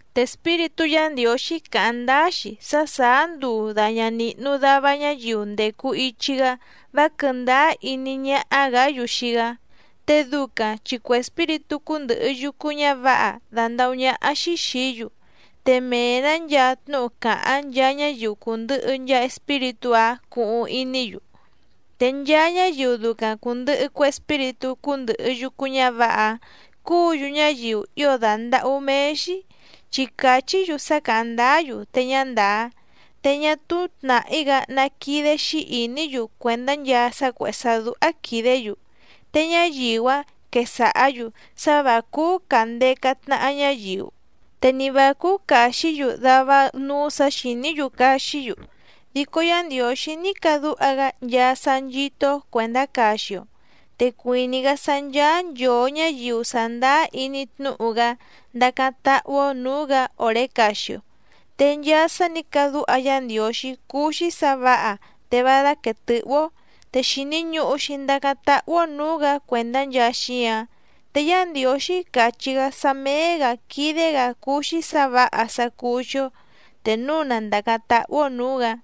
Te Espíritú Yǎ Ndiǒxí càháⁿ ndáá‑xi sá sàá nduu dàña nihnu dava ñáyiu ndècu ichi‑gá vá quɨ̀ndáá iní ñáhá‑gǎ‑yu xii‑gá, te ducaⁿ chi cue espíritú cúndɨ̀hɨ yucu ñávǎha dandàhú ñáhá‑xí xìí‑yu, te mee‑nǎ nchaa tnúhu càháⁿ nchaa ñáyiu cùndɨhɨ nchaa espíritú‑áⁿ cuhuⁿ iní‑yu. Te nchaa ñáyiu ducaⁿ cùndɨhɨ cue espíritú cúndɨ̀hɨ yucu ñávǎha‑áⁿ cúǔ‑yu ñáyiu ío dàndahú méé‑xí chi càchí‑yu sá càháⁿ ndáá‑yu te ñá ndàá, te ñá túú tnàhí‑gá ná quídé‑xí ìní‑yu cuèndá nchaa sá cuèhé sá dúhá quìdé‑yu. Te ñáyiu‑áⁿ quesàhá‑yu sá vǎ cúú càndeca tnaha ñáyiu, te ni vǎ cúú càxí‑yu dava núú sǎ xìní‑yu caxí‑yu, dico Yá Ndiǒxí ní cadúha‑gá nchaa sá nchító‑ó cuèndá caxi‑o, te cuìní‑gá sá ncháá nchòo ñáyiu sàndáá iní tnúhu‑gá ndacáⁿ táhú‑ó nǔú‑gǎ òré caxi‑o. Te nchaa sá nǐ cadúha Yá Ndiǒxí cúú‑xí sǎ vǎha te vá dáquèe tɨ́hú‑ó, te xìni ñuhu‑xi ndacáⁿ táhú‑ó nǔú‑gǎ cuèndá nchaa xíǎⁿ. Te Yá Ndiǒxí càchí‑gá sá méé‑gǎ quídé‑gǎ cúú‑xí sǎ vǎha sá cúú‑xí‑ó te núu na ndàcáⁿ táhú‑ó nǔú‑gǎ.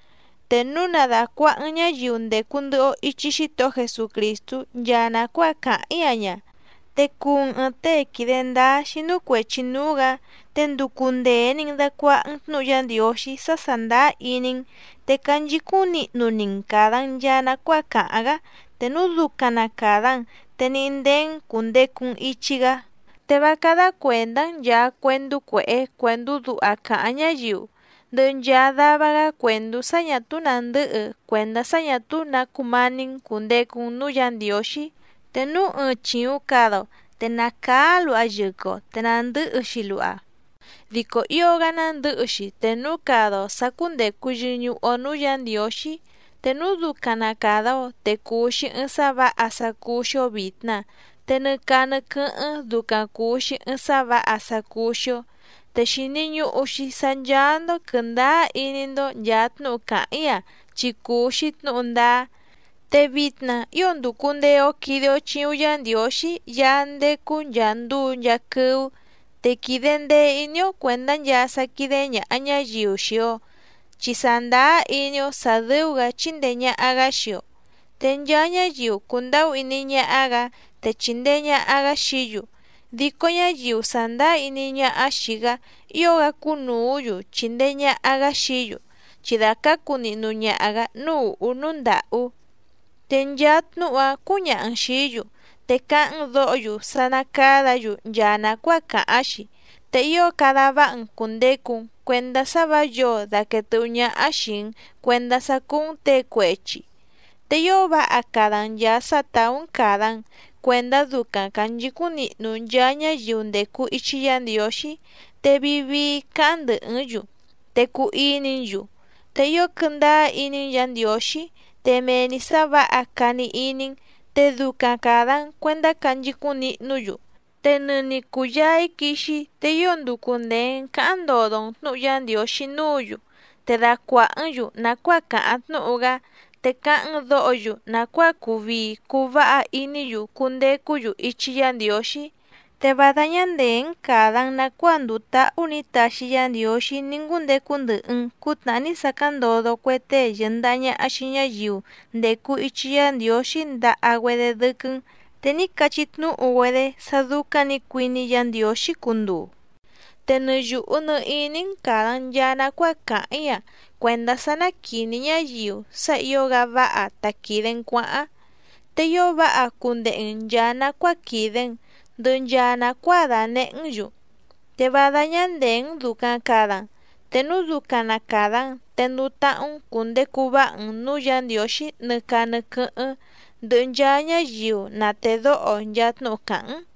Te núu na dàcuaha‑n ñáyiu ndècu ndɨhɨ‑o ichi Xítohó Jesucrìstú nchaa nàcuáa càháⁿ‑í‑a ña, te cuu‑n ɨ̀ɨⁿ tée quìde ndáá xínú cuèchi núú‑gǎ, te nducu ndèe‑ni‑n dacuaha‑n tnúhu Yá Ndiǒxí sá sàndáá iní‑n, te canchicúⁿ nihnu‑ni‑n càda‑n nchaa nacuáa càháⁿ‑gá, te núu ducaⁿ nà cada‑n, te níhí ndéé‑n cùndecu‑n ichi‑gá. Te vá cádá cuèndá‑n nchàa cuendú cuèhé cuèndú duha càháⁿ ñáyiu, ndɨhɨ nchaa dava‑gá cuèndú sá ñà túú nàndɨ́hɨ cuèndá sá ñà túú nǎ cumání‑n cùndecu‑n núú Yǎ Ndiǒxí. Te núu ɨɨⁿ chìuⁿ cada‑o te nàcaá luha yɨquɨ‑o te nàndɨ́hɨ‑xi luha, dico ío‑gá nándɨ̌hɨ‑xi te núu cada‑o sǎ cúndècu yɨñuhu‑o núú Yǎ Ndiǒxí. Te núu ducaⁿ na càda‑o te cùu‑xi ɨɨⁿ sá vǎha sá cúú‑xí‑ó vìtna, te nɨ caa nɨ quɨ́hɨ́ⁿ ducaⁿ cùu‑xi ɨɨⁿ sá vǎha sá cúú‑xí‑ó. Te xìni ñuhu‑xi sá ncháá‑ndó quɨ̀ndáá iní‑ndó nchàa tnúhu càháⁿ‑í‑a chi cùu‑xi tnúhu ndáá. Te vitna ío ndùcu ndee‑o quide‑o chiuⁿ Yá Ndiǒxí Yaá ndécú nchàa nduu nchaa quɨ́ú te quìde ndee iní‑ó cuèndá nchaa sá quídé ñàha ñáyiu xii‑o, chi sàndáá iní‑ó sǎ dɨ́ú‑gǎ chíndèe ñaha‑gá xii‑o. Te nchaa ñáyiu cùndahú iní ñáhá‑gǎ te chìndee ñaha‑gá xií‑yu, dico ñáyiu sàndáá iní ñáhá xìi‑gá ío‑gá cúnùú‑yu chìndee ñaha‑gá xií‑yu, chi dàcácu nihnu ñaha‑gǎ núú ùhú núú ndàhú. Te nchaa tnúhu‑áⁿ cǔñaha‑n xìí‑yu, te cáháⁿ‑n dǒho‑yu sá ná càdá‑yu nchaa nàcuáa càháⁿ‑xi. Te ío cada váha‑n cùndecu‑n cuendá sá vǎ yǒo daquèe tɨ́hú ñáhá xìi‑n cuendá sá cúú‑n těe cuechi, te ío váha cada‑n nchàa sá tàú‑n càda‑n cuendá ducaⁿ cànchicúⁿ nihnu nchaa ñáyiu ndècu ichi Yá Ndiǒxí, te vii vii cáháⁿ ndɨ̀hɨ́‑n‑yu, te cuu iní‑n‑yu, te ío quɨndáá iní‑n Yǎ Ndiǒxí, te mee‑ni sǎ vǎha cani iní‑n, te ducaⁿ càda‑n cuendá canchicúⁿ nihnú‑yu. Te nɨni cùyaa‑í quixi‑í, te ío nducu ndèe‑n cáháⁿ ndodo‑n tnǔhu Yá Ndiǒxí núǔ‑yu, te dacuàhá‑n‑yu nàcuáa càháⁿ tnúhu‑gá, te cáháⁿ‑n dǒho‑yu nàcuáa cuu vii cuu váha iní‑yu cundecú‑yu ichi Yá Ndiǒxí. Te vá dáñá ndèé‑n càda‑n nacuáa ndùu táhú nǐ taxi Yá Ndiǒxí ní ngúndecu ndɨhɨ‑n cǔtnàhá ní sacáⁿ ndodo cue tée yɨ̀ndaha ñaha xii ñáyiu ndècu ichi Yá Ndiǒxí ndaha‑güedé dɨ́quɨ́‑n, te ní cachí tnúhu‑güedé sá dúcáⁿ nǐ cuiní Yǎ Ndiǒxí cunduu. Te nɨ yùhu nɨ iní‑n càda‑n nchaa nacuáa càháⁿ‑í‑a cuèndá sá ná quìní ñáyiu sá ǐo‑gá váha ta quìde‑n cuáháⁿ. Te ío váha cundehe‑n nchàa nacuáa quìde‑n, ndɨhɨ nchaa nàcuáa dànehé‑n‑yu, te vá dáñá ndèé‑n dùcaⁿ cada‑n. Te núu ducaⁿ na càda‑n te nduu táhú‑n cùndecu váha‑n nǔú Yǎ Ndiǒxí nɨ caa nɨ quɨ́hɨ́ⁿ ndɨhɨ nchaa ñáyiu na tèdóho nchaa tnúhu càháⁿ‑n.